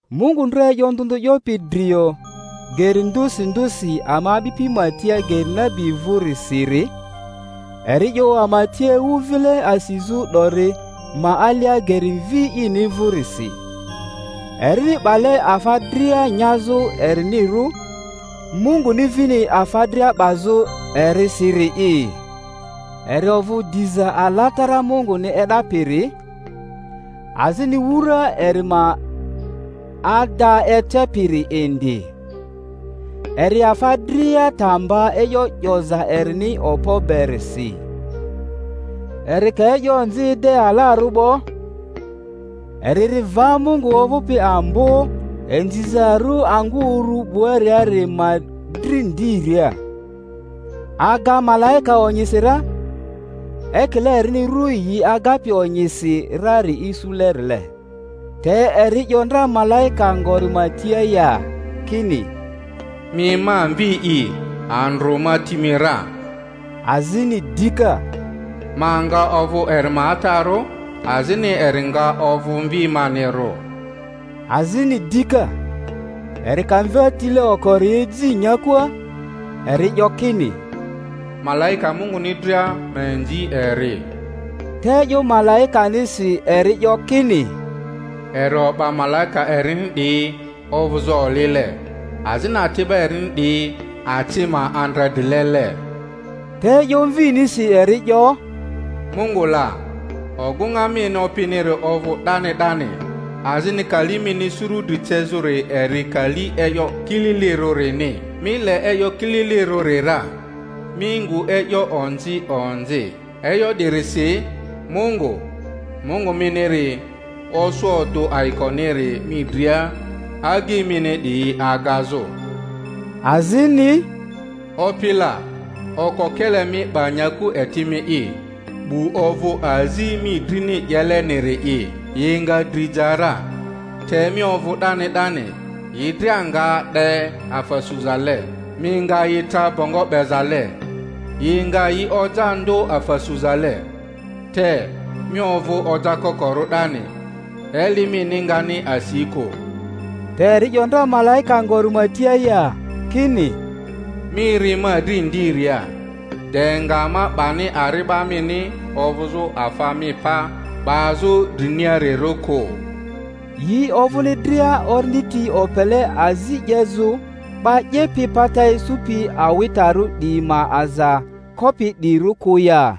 Mungu ndra e'yo ndᴜ ndᴜ 'yopi drio geri ndᴜsi ndᴜsi ama a'bipi ma tia geri nabi vᴜrisiri, eri 'yo ama tia ewu vile asizᴜ 'dori ma alia geri Mvi ini vᴜrisi, erini 'bale afa dria nyazᴜ erinirᴜ, Munguni vini afa dria 'bazᴜ erisiri'i. Eri ovᴜ diza alatara Munguni e'dapiri, azini wura eri ma ada ecepiri indi, eri afa dria ta mba e'yo 'yoza erini okpo berisi. Eri ka e'yo onzi ede alarᴜ 'bo, eri ri va Mungu ovᴜpi Ambo Inzizarᴜ angᴜ urᴜ 'buariari ma dri ndiria, aga malaika onyisi ra, ekile erini ru yi agapi onyisi rari isulerile. Te eri 'yo ndra malaika ngori ma tia ya, kini, Mi ma Mvi'i, andrᴜ ma ti mi ra? Azini dika, Ma nga ovᴜ eri ma atarᴜ, azini eri nga ovᴜ mvi manirᴜ? Azini dika, eri ka mva tile okori eji nyakua, eri 'yo kini, Malaika Munguni dria ma inzi eri. Te e'yo malaikanisi eri 'yo kini, Eri o'ba malaika erini 'diyi ovᴜzᴜ olile, azini ati'ba erini 'diyi aci ma andredrilele. Te e'yo Mvinisi eri 'yo, Mungu la, ogᴜŋa mini opiniri ovᴜ 'dani 'dani, azini kali mini suru dri cezᴜri eri kali e'yo kililirᴜrini. Mi le e'yo kililirᴜri ra, mi ngu e'yo onzi onzi; e'yo 'dirisi Mungu, Mungu miniri, osᴜ odᴜ ayikoniri mi dria agyi mini 'diyi agazᴜ. Azini, Opi la, okokele mi 'ba nyaku eti mi'i, 'bu ovᴜ azi mi drini 'yeleniri'i; yi nga dri ja ra, te mi ovᴜ 'dani 'dani; yi dria nga de afa suzale, mi nga yi tra bongo 'bezale, yi nga yi oja ndᴜ afa suzale. Te mi ovᴜ ojakokorᴜ 'dani, eli mini ngani asi kᴜ. Te eri 'yo ndra malaika ngori ma tia ya, kini, Mi ri ma dri ndiria, de nga ma 'bani ari'ba mini ovᴜzᴜ afa mi pa 'bazᴜ driniarirᴜ kᴜ. Yi ovᴜni dria orindi ti opele azi 'yezᴜ 'ba 'yepi pata isupi awitarᴜ 'diyi ma aza kopi 'diyirᴜ kᴜ ya?